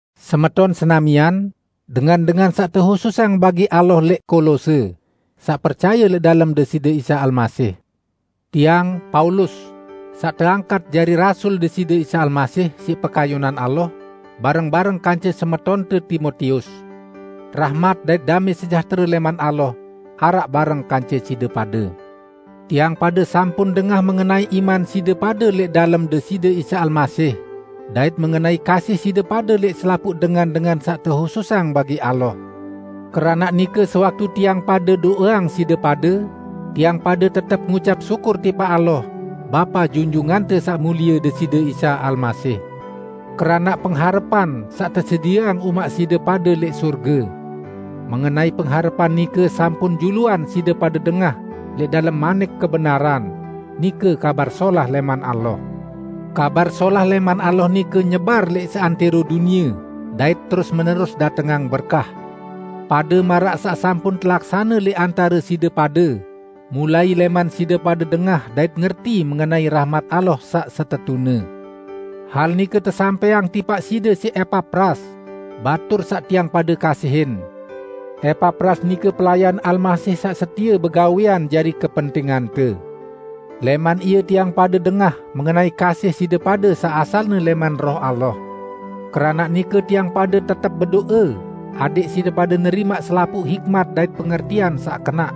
Semeton senamian, dengan-dengan saq tehususang bagi Allah lẽq Kolose, saq percaye lẽq dalem Deside Isa Almasih! Tiang, Paulus, saq teangkat jari rasul Deside Isa Almasih, -- siq pekayunan Allah --, bareng-bareng kance semetonte Timotius. Rahmat dait damẽ sejahtere lẽman Allah, araq bareng kance side pade. Tiang pade sampun dengah mengenai iman side pade lẽq dalem Deside Isa Almasih dait mengenai kasih side pade lẽq selapuq dengan-dengan saq tehususang bagi Allah. Keranaq nike sewaktu tiang pade do'eang side pade, tiang pade tetep ngucap syukur tipaq Allah, Bapa Junjungante Saq Mulie Deside Isa Almasih. Keranaq pengharepan, saq tesedieang umaq side pade lẽq sorge. Mengenai pengharepan nike sampun juluan side pade dengah lẽq dalem manik kebenaran, nike Kabar Solah lẽman Allah. Kabar Solah lẽman Allah nike nyebar lẽq seantẽro dunie dait terus-menerus datengang berkah, pade maraq saq sampun telaksane lẽq antare side pade mulai lẽman side pade dengah dait ngerti mengenai rahmat Allah saq setetune. Hal nike tesampẽang tipaq side siq Epapras, batur saq tiang pade kasihin. Epapras nike pelayan Almasih saq setie begawẽan jari kepentingante. Lẽman ie tiang pade dengah mengenai kasih side pade saq asalne lẽman Roh Allah. Keranaq nike tiang pade tetep bedo'e adẽq side pade nerimaq selapuq hikmat dait pengertian saq kenaq,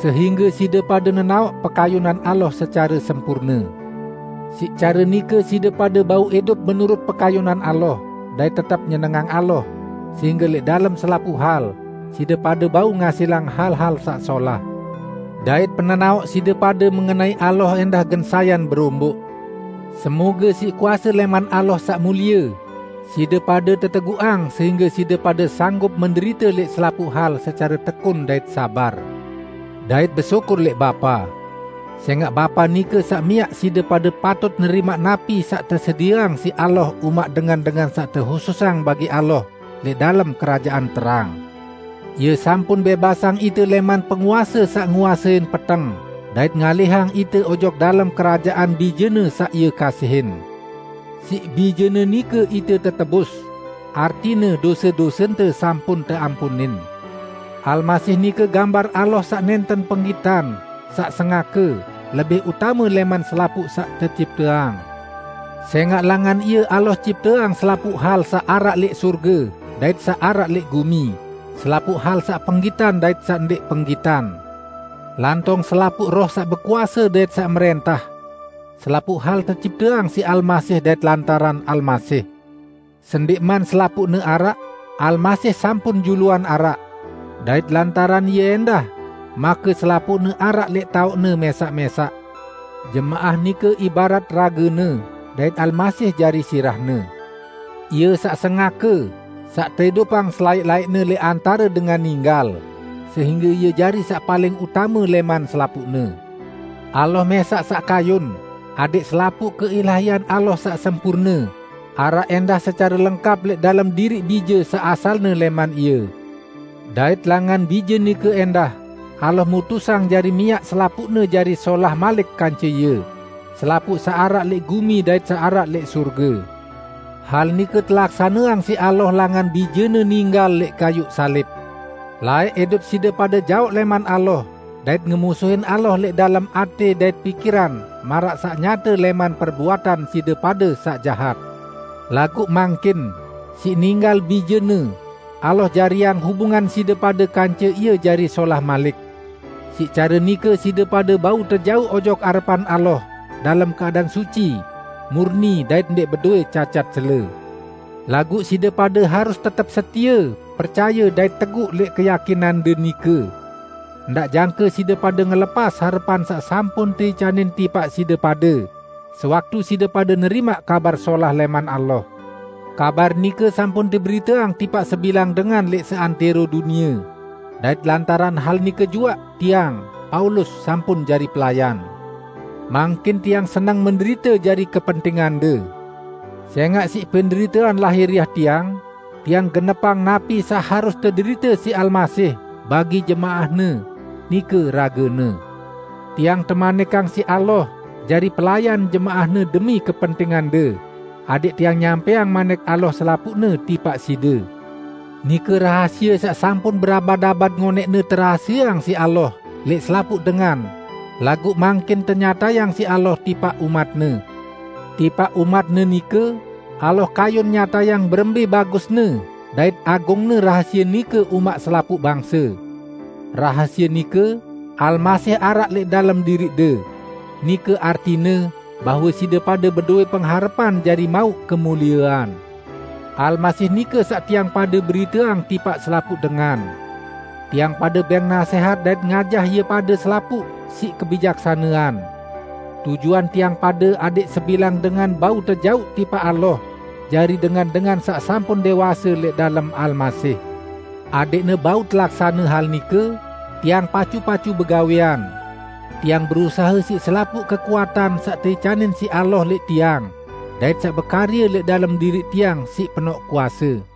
sehingge side pade nenaoq pekayunan Allah secare sempurne. Siq care nike side pade bau idup menurut pekayunan Allah, dait tetep nyenengang Allah, sehingge lẽq dalem selapuq hal, side pade bau ngasilang hal-hal saq solah. Dait penenaoq side pade mengenai Allah ẽndah gen sayan beromboq. Semoge siq kuase lẽman Allah saq mulie, side pade teteguqang sehingge side pade sanggup menderite lẽq selapuq hal secare tekun dait sabar dait besyukur lẽq Bapa. Sẽngaq Bapa nike saq miaq side pade patut nerimaq napi saq tesedieang siq Allah umaq dengan-dengan saq tehususang bagi Allah lẽq dalem Kerajaan Terang. Ie sampun bẽbasang ite lẽman penguase saq nguasein peteng dait ngalihang ite ojok dalem Kerajaan Bije-Ne saq Ie kasihin. Siq Bije-Ne nike ite tetebus; artine dose-dosente sampun teampunin. Almasih nike gambar Allah saq nẽnten penggitan, saq sengake, lebih utame lẽman selapuq saq tecipteang. Sẽngaq langan Ie Allah cipteang selapuq hal saq araq lẽq sorge dait saq araq lẽq gumi, selapuq hal saq penggitan dait saq ndẽq penggitan, lantong selapuq roh saq bekuase dait saq mrẽntah. Selapuq hal tecipteang siq Almasih dait lantaran Almasih. Sendẽqman selapuqne araq, Almasih sampun juluan araq. Dait lantaran Ie ẽndah make selapuqne araq lẽq taoqne mẽsaq-mẽsaq. Jemaah nike ibarat ragene, dait Almasih jari sirahne. Ie saq sengake, saq teidupang selaẽq-laẽqne lẽq antare dengan ninggal, sehingge Ie jari saq paling utame lẽman selapuqne. Allah mẽsaq saq kayun adẽq selapuq keilahian Allah saq sempurne, araq ẽndah secare lengkap lẽq dalem diriq Bije saq asalne lẽman Ie. Dait langan Bije nike ẽndah Allah mutusang jari miaq selapuqne jari solah malik kance Ie -- selapuq saq araq lẽq gumi dait saq araq lẽq sorge. Hal nike telaksaneang siq Allah langan Bije-Ne ninggal lẽq kayuq salib. Laẽq idup side pade jaoq lẽman Allah dait ngemusuhin Allah lẽq dalem atẽ dait pikiran maraq saq nyate lẽman perbuatan side pade saq jahat. Laguq mangkin, siq ninggal Bije-Ne, Allah jariang hubungan side pade kance Ie jari solah malik. Siq care nike side pade bau tejauq ojok arepan Allah dalem keadaan suci, murni dait ndẽq bedowẽ cacat cele. Laguq side pade harus tetep setie percaye dait teguq lẽq keyakinande nike. Ndaq jangke side pade ngelepas harepan saq sampun teicanin tipaq side pade sewaktu side pade nerimaq Kabar Solah lẽman Allah. Kabar nike sampun teberiteang tipaq sebilang dengan lẽq seantẽro dunie. Dait lantaran hal nike juaq tiang, Paulus sampun jari pelayan. Mangkin tiang seneng menderite jari kepentingande. Sẽngaq siq penderitean lahiriah tiang, tiang genepang napi saq harus tederite siq Almasih bagi jemaah-Ne, nike rage-Ne. Tiang temanikang siq Allah jari pelayan jemaah-Ne demi kepentingande, adẽq tiang nyampẽang Manik Allah selapuqne tipaq side; nike rahasie saq sampun berabad-abad ngonẽqne terahasieang siq Allah lẽq selapuq dengan, laguq mangkin tenyatayang siq Allah tipaq umat-Ne. Tipaq umat-Ne nike Allah kayun nyatayang berembẽ bagusne dait agungne rahasie nike umaq selapuq bangse. Rahasie nike: Almasih araq lẽq dalem diriqde. Nike artine bahwe side pade bedowẽ pengharepan jari mauq kemuliean. Almasih nike saq tiang pade beriteang tipaq selapuq dengan. Tiang pade bẽng nasẽhat dait ngajah ie pade selapuq siq kebijaksanean. Tujuan tiang pade adẽq sebilang dengan bau tejauq tipaq Allah jari dengan-dengan saq sampun dẽwase lẽq dalem Almasih. Adẽqne bau telaksane hal nike, tiang pacu-pacu begawẽan. Tiang berusahe siq selapuq kekuatan saq teicanin siq Allah lẽq tiang, dait saq bekarye lẽq dalem diriq tiang siq penoq kuase.